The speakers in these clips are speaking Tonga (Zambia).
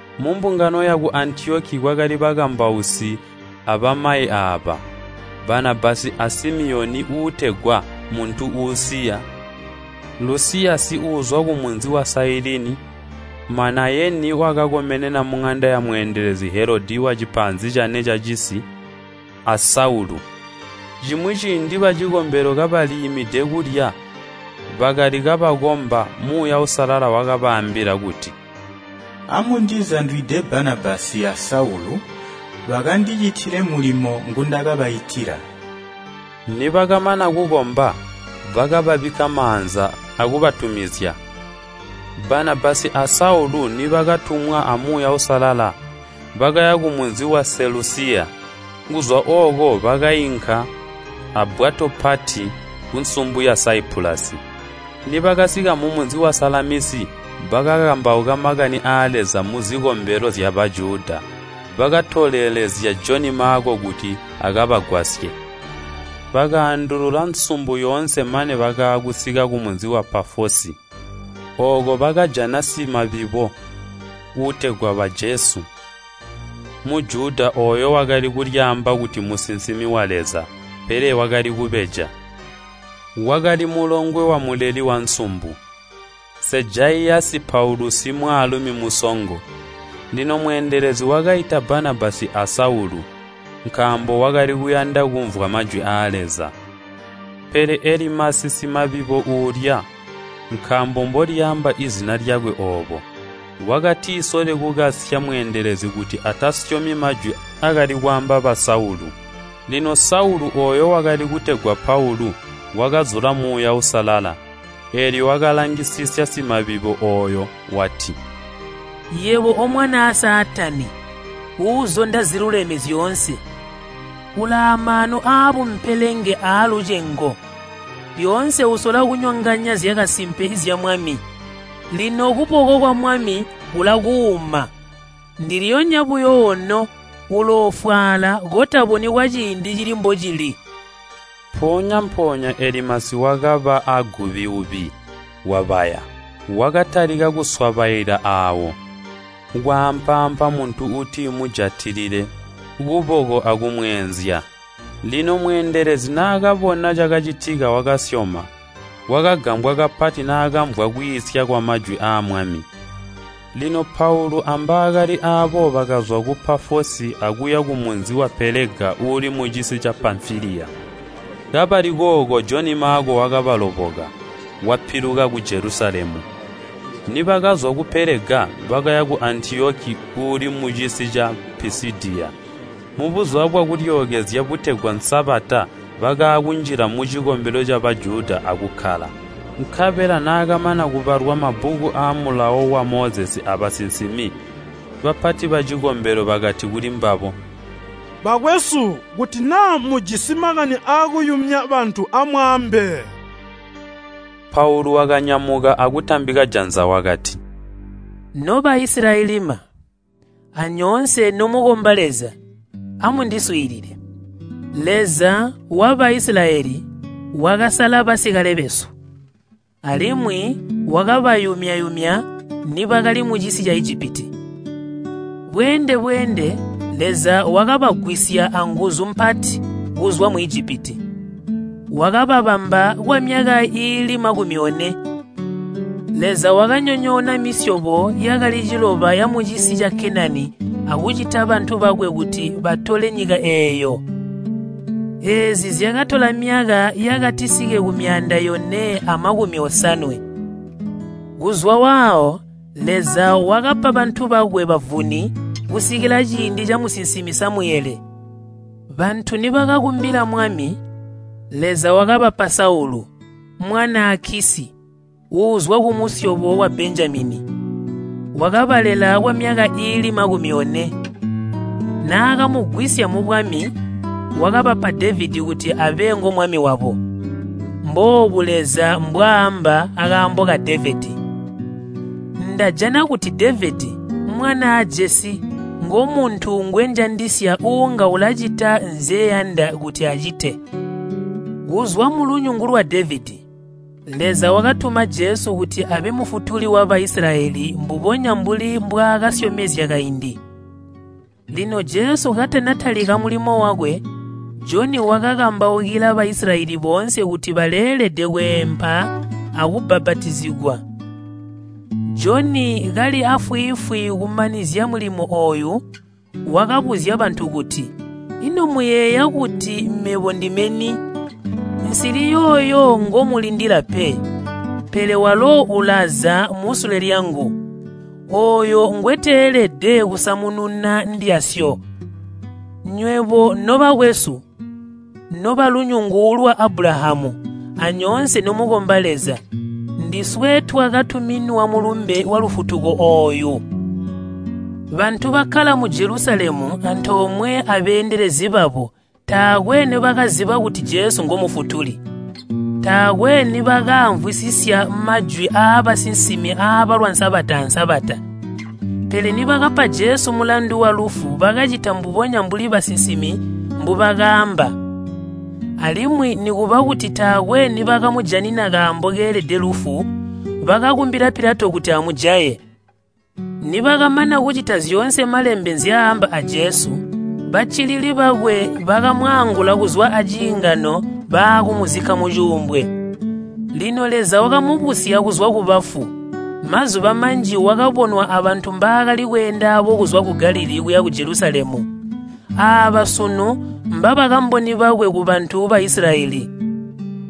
Mumbungano yaku Antiyoki kwakali bakambausi abamayi aaba, Banabasi a Simiyoni (uutegwa Muntu Uusiya), Lusiyasi (uuzwa kumunzi wa Sailini), Manayeni (wakakomenena muŋanda yamweendelezi Helodi), a Saulu. Cimwi ciindi bacikombelo kabaliimide kulya bakali kabakomba, Muuya Uusalala wakabaambila kuti, “Amundizandwide Banabasi a Saulu bakandicitile mulimo ngundakabaitila.” Nibakamana kukomba, bakababikka maanza akubatumizya. Banabasi a Saulu nibakatumwa a Muuya Uusalala, bakaya kumunzi wa Selusiya. Kuzwa ooko bakainka abbwato pati kunsumbu ya Saipulasi. Nibakasika mumunzi wa Salamisi bakakambauka makani aa Leza muzikombelo zya Bajuda. Bakatolelezya Joni Maako kuti akabagwasye. Bakaandulula nsumbu yoonse mane bakaakusika kumunzi wa Pafosi. Ooko bakajana simabibo uutegwa Baajesu, Mujuda ooyu wakali kulyaamba kuti mmusinsimi wa Leza, pele wakali kubeja. Wakali mulongwe wamuleli wansumbu, Seejaiyasi Paulusi, mwaalumi musongo. Lino mweendelezi wakaita Banabasi a Saulu, nkaambo wakali kuyanda kumvwa majwi aa Leza. Pele Elimasi simabibo uulya (nkaambo mbolyaamba izina lyakwe oobo), wakatisole kukasya mweendelezi kuti atasyomi majwi aakali kwaamba ba Saulu. Lino Saulu, ooyo wakali kutegwa Paulu, wakazula Muuya Uusalala, eelyo wakalangisisya simabibo ooyo wati, “Yebo omwanaaa Saatani uuzonda ziluleme zyoonse, ulaamaanu aabumpelenge aalucengo, lyoonse usola kunyonganya zyakasimpe zya Mwami! Lino kuboko kwa Mwami kulakuuma. Ndilyonya buyo ono uloofwaala kotaboni kwaciindi cili mbocili.” Mpoonya-mpoonya Elimasi wakaba aagubiubi, wabaya. Wakatalika kuswabaila aawo, kwaampaampa muntu uuti mujatilile kuboko akumweenzya. Lino mweendelezi naakabona cakacitika wakasyoma. Wakagambwa kapati naakamvwa kwiisya kwamajwi aa Mwami. Lino Paulu ambaakali aabo bakazwa ku Pafosi akuya kumunzi wa Pelega uuli mucisi ca Pamfiliya. Kabali kooko Joni Maako wakabaloboka, wapiluka ku Jelusalemu. Nibakazwa ku Pelega, bakaya ku Antiyoki uuli mucisi ca Pisidiya. Mu Buzuba bwa kulyookezya butegwa Sabata bakaakunjila mucikombelo ca Bajuda akukkala. Nkabela naakamana kubalwa mabbuku aa Mulawo wa Mozesi aabasinsimi, bapati bacikombelo bakati kulimbabo, “Bakwesu, kuti naa mujisi makani aakuyumya bantu amwaambe.” Paulu wakanyamuka akutambika janza wakati, “No Baisilayelima, anyoonse nomukomba Leza, amundiswiilile! Leza wa Baisilayeli wakasala basikale besu, alimwi wakabayumya nibakali mucisi ca Ijipiti. Bweende-bweende Leza wakabagwisya anguzu mpati kuzwa mu Ijipiti, wakababamba kwamyaka iili makumi one. Leza wakanyonyoona misyobo yakali ciloba yamucisi ca Kenani akucita bantu bakwe kuti batole nyika eeyo. Eezi zyakatola myaka yakatisike ku myaanda yone amakumi osanwe. “Kuzwa waawo Leza, wakapa bantu bakwe bavuni kusikila ciindi camusinsimi Samuyele. Bantu nibakakumbila mwami, Leza wakabapa Saulu, mwanaa Kisyi, uuzwa kumusyobo wa Benjamini. Wakabalela kwamyaka iili makumi one. Naakamugwisya mubwami, wakabapa Devedi kuti abe ngomwami wabo. Mboobu Leza mbwaamba akaambo ka Devedi, ‘Ndajana kuti Devedi, mwanaa Jese ngomuntu ngwenjandisya, uunga ulacita nzyeyanda kuti acite.’ Kuzwa mulunyungu lwa Devedi, Leza wakatuma Jesu kuti abe Mufutuli wa Baisilayeli mbubonya mbuli mbwaakasyomezya kaindi. Lino Jesu katanatalika mulimo wakwe, Joni wakakambaukila Baisilayeli boonse kuti baleelede kweempa akubbapatizigwa. Joni kali aafwiifwi kumanizya mulimo ooyu, wakabuzya bantu kuti, ‘Ino muyeeya kuti mebo ndime ni? Nsili yooyo ngomulindila pe, pele walo ulaza musule lyangu. Ooyo ngweteelede kusamununa ndyasyo.’ “Nywebo nobakwesu, nobalunyungu lwa Abulahamu, anyoonse nomukomba Leza, ndiswe twakatuminwa mulumbe walufutuko ooyu! Bantu bakkala mu Jelusalemu antoomwe abeendelezi babo taakwe nibakaziba kuti Jesu ngo Mufutuli. Taakwe nibakaamvwisisya majwi aabasinsimi aabalwa Sabata a Sabata. Pele nibakapa Jesu mulandu walufu bakacita mbubonya mbuli basinsimi mbubakaamba. Alimwi nikuba kuti taakwe nibakamujanina kaambo keelede lufu, bakakumbila Pilato kuti amujaye. Nibakamana kucita zyoonse malembe nzyaamba a Jesu, baccilili bakwe bakamwaangula kuzwa aciingano baakumuzikka mucuumbwe. Lino Leza wakamubusya kuzwa kubafu, Mazuba manji wakabonwa abantu mbaakali kweenda aabo kuzwa ku Galilii kuya ku Jelusalemu. Aaba sunu mbabakamboni bakwe kubantu ba Isilayeli.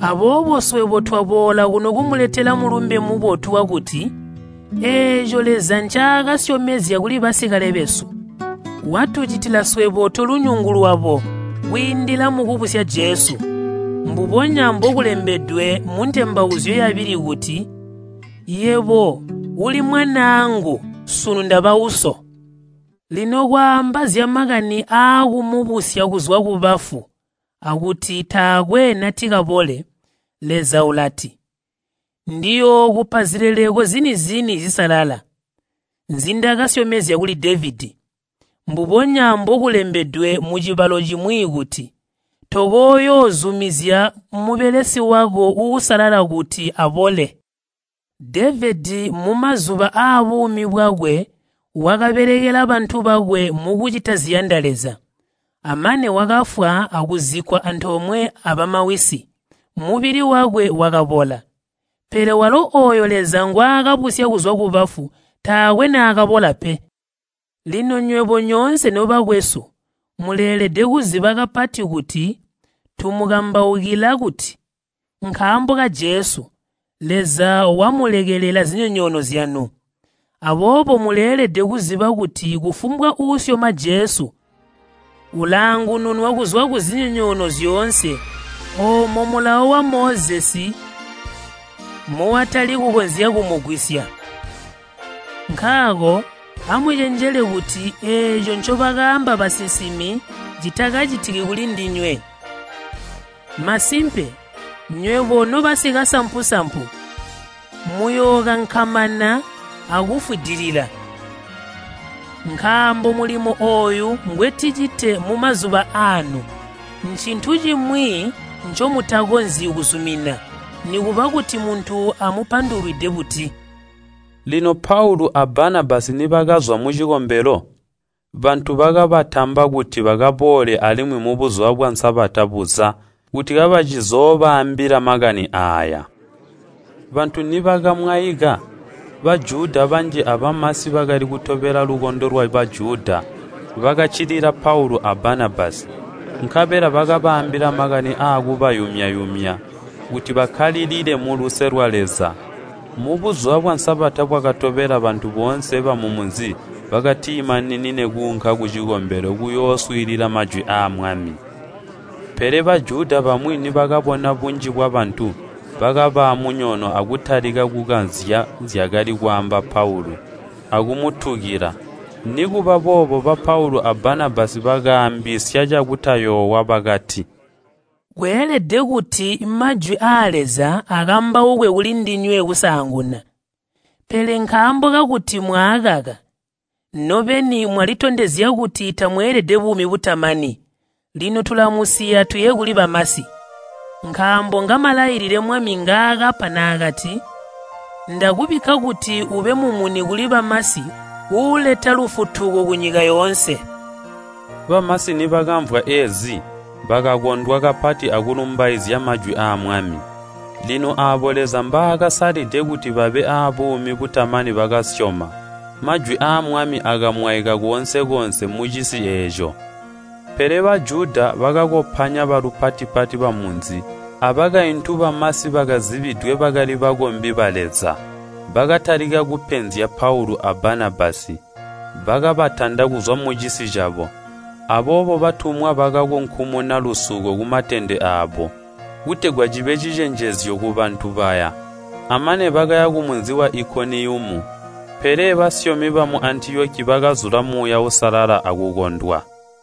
Aboobo swebo twaboola kuno kumuletela mulumbe mubotu wakuti, eeco Leza ncaakasyomezya kuli basikale besu, watucitila swebo tolunyungu lwabo kwiindila mukubusya Jesu. Mbubonya mbokulembedwe mu Ntembauzyo yabili kuti, ‘Yebo uli mwanaangu, sunu ndaba Uso.’ Lino kwaamba zyamakani aakumubusya kuzwa kubafu akuti taakwe natikabole, Leza ulati, ‘Ndiyookupa zileleko zini-zini zisalala, nzindakasyomezya kuli Devedi.’ Mbubonya mbokulembedwe mucibalo cimwi kuti, ‘Tokooyoozumizya mubelesi wako uusalala kuti abole.’ Devedi mumazuba aabuumi bwakwe wakabelekela bantu bakwe mukucita ziyanda Leza, amane wakafwa akuzikkwa antoomwe abamawisi, mubili wakwe wakabola. Pele walo ooyo Leza ngwaakabusya kuzwa kubafu, taakwe naakabola pe. Lino nywebo nyoonse nobakwesu muleelede kuziba kapati kuti tumukambaukila kuti, nkaambo ka Jesu, Leza wamulekelela zinyonyoono zyanu. Aboobo muleelede kuziba kuti kufumbwa uusyoma Jesu ulaangununwa kuzwa kuzinyonyoono zyoonse oomo Mulawo wa Mozesi muwatali kukonzya kumugwisya. Nkaako, amucenjele kuti eeco ncobakaamba basinsimi citakacitiki kulindinywe, ‘Masimpe, nywebo nobasikasampu-sampu! Muyookankamana akufwidilila. Nkaambo mulimo ooyo ngweticite mumazuba aanu, ncintu cimwi ncomutakonzyi kuzumina, nikuba kuti muntu amupandulwide buti!’” Lino Paulu a Banabasi nibakazwa mucikombelo, bantu bakabatamba kuti bakaboole alimwi mubuzuba bwa Sabata buza kuti kabacizoobaambila makani aaya. Bantu nibakamwaika, Bajuda banji abamasi bakali kutobela lukondo lwa Bajuda bakaccilila Paula a Banabasi. Nkabela bakabaambila makani aakubayumya-yumya kuti bakkalilile muluse lwa Leza. Mubuzuba bwa Sabata bwakatobela bantu boonse bamumunzi bakatimaninine kuunka kucikombelo kuyooswiilila majwi aa Mwami. Pele Bajuda bamwi nibakabona bunji bwabantu, bakaba amunyono akutalika kukazya zyakali kwaamba Paulu, akumutukila. Nikubaboobo ba Paulu a Banabasi bakaambisya cakutayoowa bakati, “Kweelede kuti majwi aa Leza akambaukwe kulindinywe kusaanguna. Pele nkaambo kakuti mwaakaka, nobeni mwalitondezya kuti tamweelede buumi butamani, lino tulamusiya tuye kuli bamasi. Nkaambo ngamalailile Mwami ngaakapa naakati, ‘Ndakubikka kuti ube mumuni kuli bamasi uuleta lufutuko kunyika yoonse.’” Bamasi nibakaamvwa eezi, bakakondwa kapati akulumbaizya majwi aa Mwami. Lino aabo Leza mbaakasalide kuti babe abuumi butamani bakasyoma. Majwi aa Mwami akamwaika koonse-koonse mucisi eeco. Pele Bajuda bakakopanya balupati-pati bamunzi abakaintu bamasi bakazibidwe bakali bakombi ba Leza. Bakatalika kupenzya Paulu a Banabasi, bakabatanda kuzwa mucisi cabo. Aboobo batumwa bakakunkumuna lusuko kumatende aabo, kutegwa cibe cicenjezyo kubantu baya, bamane bakaya kumunzi wa Ikoniyumu. Pele basyomi bamu Antiyoki bakazula Muuya Uusalala akukondwa.